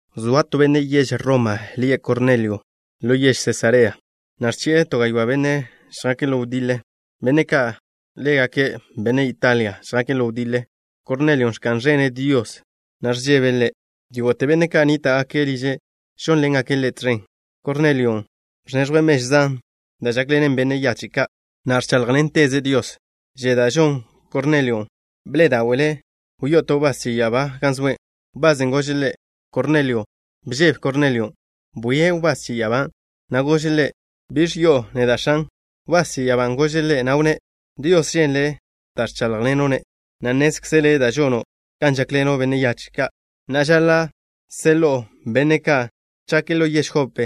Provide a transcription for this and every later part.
Wzóa to benne' yež Roma lie' Kornelio ḻo yež Sesarea, na' ẕchi'e to gaywá' benne' žjake' ḻo wdiḻe, benne' ka' légake' Benne' Italia Žjake' Ḻo Wdiḻe. Kornelion' ẕka'n ẕene' Dios, na' ẕžebe' Ḻe'. Yógo'te benne' ka' nníta'gake' liže' žónḻengake' ḻe' tẕen. Kornelion' ẕneẕjwe' mežw zan da' žákḻenen benne' yache' ka', na' ẕcháḻjḻenteze' Dios. Žedá chonne Kornelion' bḻe'e dáwe'le' wyó'o to wbás che ya'abá gan zoe'. Wbasen' gože' ḻe': —Kornelio. Bžebe Kornelion'. Bwie' wbás che ya'abán', na' gože' ḻe': —¿Biẕ yi'o neda' X̱an? Wbás che ya'abán' gože' ḻe', na' wnné': —Dios ženle' da' ẕcháḻjḻeno'-ne', na' nnézkzele' da' žono', kan žákḻeno' benne' yache' ka'. Na'a, žaḻa' seḻo'o benne' ka' chjake' ḻo yež Jope,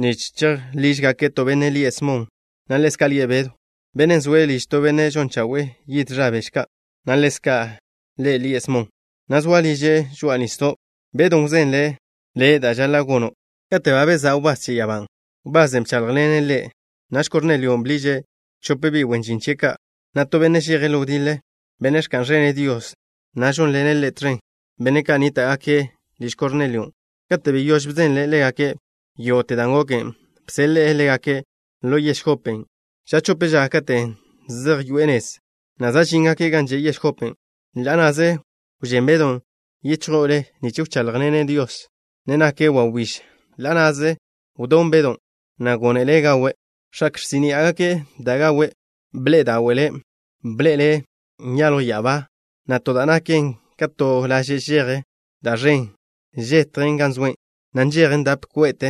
nich chejlížgake' to benne' lie' Smon, na' ḻezka' lie' Bedw. Bennen' zoe' liž to benne' žon chawe'e yid ẕa beže, na' ḻezka' lie' Smon, na' zoa liže' žoa'a nisdo'. Bedon' wzenle' le' da' žaḻa' gono'. Kate' ba bezá' wbás che ya'abán', wbasen' bcháḻjḻene' ḻe', naž Kornelion' bḻiže' chope bi' wen žin chie' ka', na' to benne' žeje' ḻo wdiḻe, benne' ẕka'n ẕene' Dios, na' žónḻene' tẕen benne' ka' nníta'gake' liž Kornelion'. Kate' beyóž bzenle' ḻégake' yógo'te dan' goken, bseḻe'e ḻégake' ḻo yež Jopen'. Ža chope ža, katen' zej yoe'e nez, na' za' žíngake' gan že' yež Jopen', ḻa' na'ze wžén Bedon' yíchjo'ole nich wcháḻjḻene' Dios, ne nak wawbíž. Ḻa' na'ze wdón Bedon', na' gónele' gawe'. X̱ak žsi'ní'agake' da' gawe', bḻe'e dáwe'le'. Bḻe'ele' nyaljw ya'abá, na' to da' naken ka to laže' žeje ẕen žetjen gan zoe', na' nžejen dap kwe'te.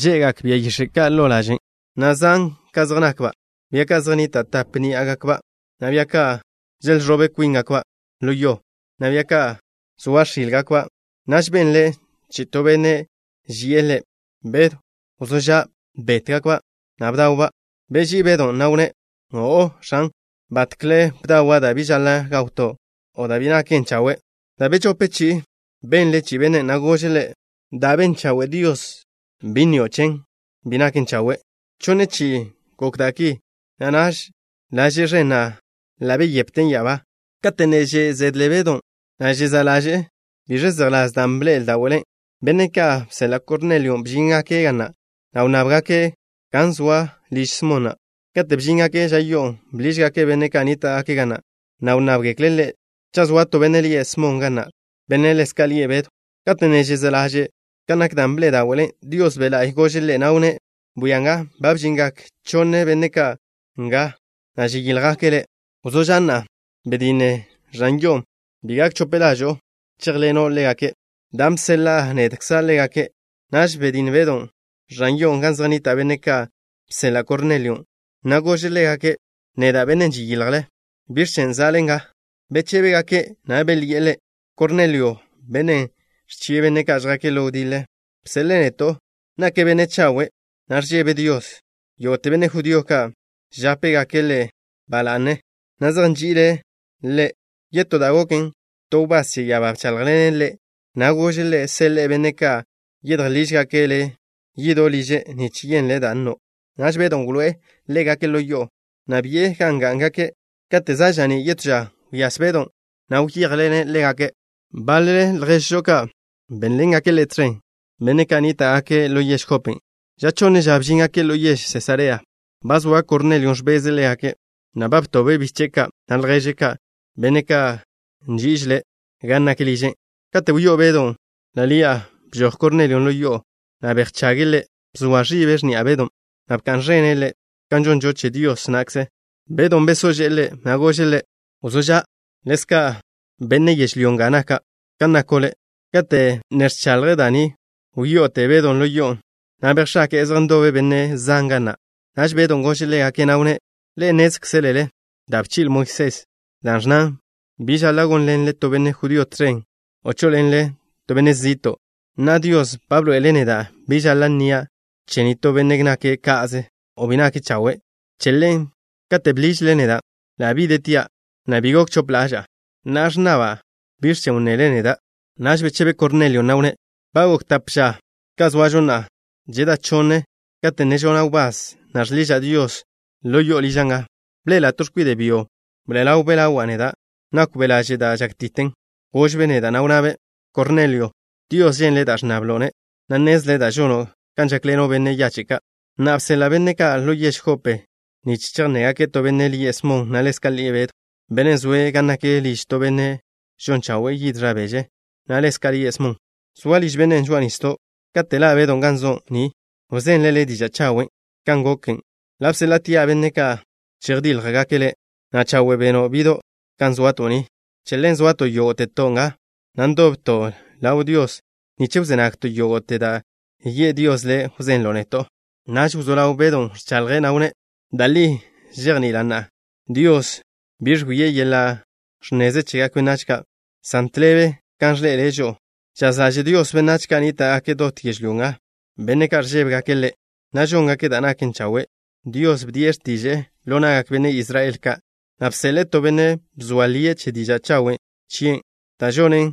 Žiagak bia yix̱e' ka' ḻaw lažen', na' zan kan zej nakba', bia ka' zej nnita' tape ni'a ná'gakba', na' bia ka' želẕobe kwíngakba' ḻo yo, na' bia ka' zoa x̱ílgakba'. Naž benle' chi'i to benne' ži'e ḻe': —Bedw, wzó ža'. Bet-ba', na' bdaw-ba'. Beží'i Bedon', na' wnné': —O'o, X̱an. Batkle bdawa' da' bi žaḻa' gawto' o da' bi naken chawe'. Da' bežope chi'i benle' chi'i bennen', na' gože' ḻe': —Da' ben chawe' Dios, bi nnio' chen: “Bi naken chawe'.” Chonne chi'i gok da' ki, na' naž laže' ẕen na' ḻa' beyepten ya'abá. Kate' ne žek zedle Bedon', na' žezá' ḻaže'e biẕ zejḻás dan' bḻe'e dáwe'le', benne' ka' bseḻa' Kornelion' bžíngake' ga na', na' wnnábgake' gan zoa liž Smon na'. Kate' bžíngake' ža yo'on', bḻížgake' benne' ka' nníta'gake' ga na', na' wnnábgekle' ḻégake' cha' zoa to benne' lie' Smon ga na', bennen' ḻezka' lie' Bedw. Kate' ne žezá' ḻaže' Bedon' kan nak dan' bḻe'e dáwe'le', Dios Be' La'y gože' ḻe', na' wnné': —Bwia nga. Ba bžingak chonne benne' ka' nga, na' žíljgake' le'. Wzó ža' na'a. Betj ẕan yo'o. Bi gak chope ḻažo'o chéjḻeno' ḻégake', dan' bseḻa'a nedkza' ḻégake'. Naž betj Bedon' ẕan yo'o gan zej nnita' benne' ka' bseḻa' Kornelion', na' gože' ḻégake': —Neda' bennen' žiljle. ¿Biẕ chen' za'le nga? Bechébegake', na' belyi'e ḻe': —Kornelio, bennen' ẕchi'e benne' ka' žjake' ḻo wdiḻe, bseḻe'e neto'. Nake' benne' chawe', na' ẕžebe' Dios. Yógo'te benne' judío ka' žápegake' bennen' ba la'ne, na' zej nži'ile' ḻe'. Yetó da' goken, to wbás che ya'abá bcháḻjḻene' ḻe', na' gože' ḻe' seḻe'e benne' ka' yedjlížgake' le' yido' liže' nich yenle' da' nno'. Naž Bedon' wḻoé'e ḻégake' ḻo yo'o, na' bi'e gan gá'ngake'. Kate' za' ža'ní' yetó ža, wyase Bedon', na' wyéjḻene' ḻégake'. Baḻe lježžo ka' bénḻengake' ḻe' tẕen, benne' ka' nníta'gake' ḻo yež Jopen'. Ža chonne ža, bžíngake' ḻo yež Sesarea. Ba zoa Kornelion' ẕbeze' ḻégake', na' ba btobe' biche'e ka', na' lježe' ka', benne' ka' nží'ižele', gan nak liže'. Kate' wyáz Bedon' ḻi'a, bžoj Kornelion' ḻo yo'on', na' bejchage' ḻe'. Bzoa ẕibe' x̱ni'a Bedon', na' bka'n ẕene' ḻe' kan žonžo che Dios na'kze. Bedon' besó že'e ḻe', na' gože' ḻe': —Wzó ža'. Ḻezka' benne' yežlyó nga naka' kan nako' le'. Kate' ne ẕchaḻje' da' ni, wyo'ote Bedon' ḻo yo'on', na' bejx̱ake'e zej ndobe benne' zan ga na'. Naž Bedon' gože' ḻégake', na' wnné': —Ḻe'e nnézkzelele da' bchi'le Moisés, dan' ẕnnan bi žaḻa' gonḻen to benne' judío tẕen o chó'oḻene' to benne' zi'to'. Na'a, Dios ba bḻoe'ele' neda' bi žaḻa' nnia' che nitó benne' nake' ka'ze o bi nake' chawe'. Che ḻen, kate' bḻižle neda', ḻa' bidtia', na' bi gok chope ḻaža'a. Na'a ẕnnaba', ¿biẕ chen' wnnele neda'? Naž bechebe Kornelion', na' wnné': —Ba gok tape ža ka zoažo na'a, žedá chonne, kate' ne žona' wbás, na' žḻiža' Dios ḻo liža' nga, bḻe'ela' to x̱kwide' byo. Bḻoe'e ḻawbe' ḻawa' neda', nákwbe' laže' da' žákti'ten. Gožbe' neda', na' wnnabe': “Kornelio. Dios ženle' da' ẕnnablo'-ne', na' nnezle' da' žono', kan žákḻeno' benne' yache' ka'. Na'a, bseḻa' benne' ka' ḻo yež Jope nich chejnnégake' to benne' lie' Smon, na' ḻezka' lie' Bedw. Bennen' zoe' gan nak liž to benne' žon chawe'e yid ẕa beže, na' ḻezka' lie' Smon. Zoa liž bennen' žoa'a nisdo'. Kate' ḻa' Bedon' ga zo' ni, wzenle' le' diža' chawen'.” Ka' goken, ḻa' bséḻa'tia' benne' ka' chejtíḻjgake' le', na' chawe' beno' bido' gan zoato' ni. Che ḻen zoato' yógo'teto' nga, na' ndobto' ḻaw Dios nich wzé nagto' yógo'te da' ye' Dios le' wzenlo' neto'. Naž wzó ḻaw Bedw ẕchaḻje', na' wnné': —Da' li žejni'ila' na'a, Dios bi ẕwíe' yeḻa' ẕnneze chegak benách ka', san tḻebe kan ẕḻe'ele' žo'o. Žaz ḻaže' Dios benách ka' nníta'gake' dot yežlyó nga, benne' ka' ẕžébegake' Ḻe', na' žóngake' da' naken chawe'. Dios bdie' x̱tiže'e ḻo na'gak benne' Israel ka', na' bseḻe'e to benne' bzoa lie' che diža' chawen' chie', da' žonen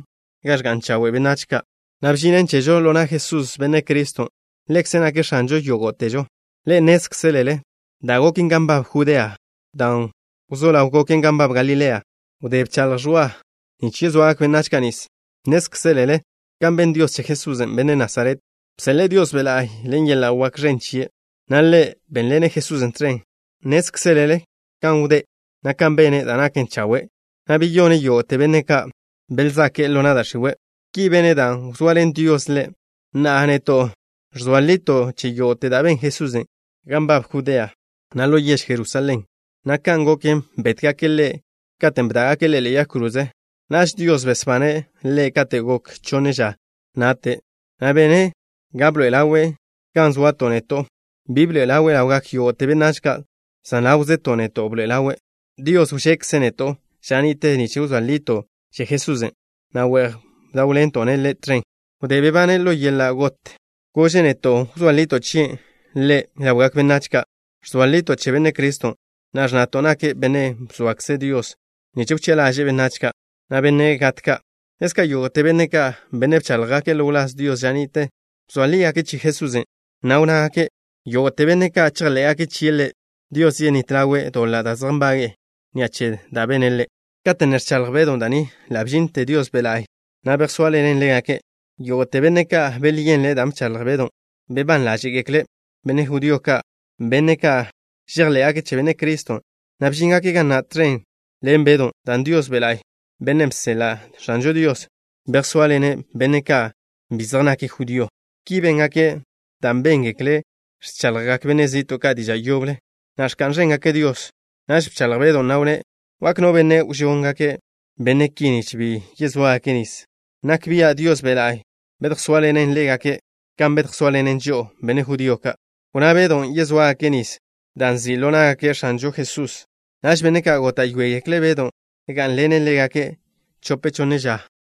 ga ẕga'n chawe' benách ka', na' bžinen chežo ḻo na' Jesús, Benne' Criston'. Ḻekze' nake' X̱anžo yógo'težo. Ḻe'e nnézkzelele da' goken gan nbab Judea, dan' wzó ḻaw goken gan nbab Galilea wdé bchaḻj Ẕwa nich yezóagak benách ka' nis. Nnézkzelele kan ben Dios che Jesusen', Benne' Nasaret. Bseḻe'e Dios Be' La'y ḻen yeḻa' wak ẕen chie', na' Ḻe' bénḻene' Jesusen' tẕen. Nnézkzelele kan wdé', na' kan bene' da' naken chawe', na' beyone' yógo'te benne' ka' belzake'e ḻo na' da' x̱iwe'. Ki bene', dan' wzoaḻen Dios Ḻe'. Na'a, neto' ẕzoa lito' che yógo'te da' ben Jesusen' gan nbab Judea, na' ḻo yež Jerusalén, na' kan goken, bétgake' Ḻe', katen' bdá'gake' Ḻe' ḻe'e yag kroze. Naž Dios besbane' Ḻe' kate' gok chonne ža nate', na' bene' ga bḻoe'e ḻawe' gan wzoato' neto'. Bi bḻoe'e ḻawe' ḻawgak yógo'te benách ka', san ḻáwzeto' neto' bḻoe'e ḻawe'. Dios wžekze' neto' ža ni'te nich wzóa lito' che Jesusen', na' we'j bdáwḻento' Ḻe' tẕen wdé bebane' ḻo yeḻa' got. Dios gože' neto' wzóa lito' chie' Ḻe' ḻawgak benách ka', na' ẕzoa lito' che Benne' Criston', na' ẕnnato' nake' Bennen' bzoakze Dios nich wchi'a ḻaže'e benne' ban ka', na' benne' gat ka'. Ḻezka' yógo'te benne' ka', benne' bcháḻjgake' ḻo wláz Dios ža ni'te, bzoa lígake' che Jesusen', na' wnnágake': “Yógo'te benne' ka' chejḻé'gake' chie' Ḻe', Dios yenít ḻawe' doḻa' da' zej nbage'e ni'a che da' bene' Ḻe'.” Kate' ne ẕchaḻj Bedw da' ni, ḻa' bžinte Dios Be' La'y, na' bedjsóaḻene' ḻégake', yógo'te benne' ka' belyenle' dan' bchaḻj Bedon'. Bebán ḻáže'gekle benne' judío ka', benne' ka' žejḻé'gake' che Benne' Criston', na' bžíngake' ga na' tẕen ḻen Bedon', dan' Dios Be' La'y, Benne' bseḻa' X̱ažo Dios, bedjsóaḻene' benne' ka' bi zej nake' judío. Ki béngake' dan' béngekle' ẕchaḻjgak benne' zi'to' ka' diža' yoble, na' ẕka'n ẕéngake' Dios. Naž bchaḻj Bedon', na' wnné': —¿Wak no benne' wžóngake' benne' ki nich bi yezóagake' nis? Nak bia' Dios Be' La'y bedjsóaḻene' ḻégake', kan bedjsóaḻene' žo'o, benne' judío ka'. Wnná Bedon' yezóagake' nis dan' nzi' ḻo ná'gake' X̱anžo Jesús. Naž benne' ka' góta'yoegekle' Bedon' gá'nḻene' ḻégake' chope chonne ža ka'.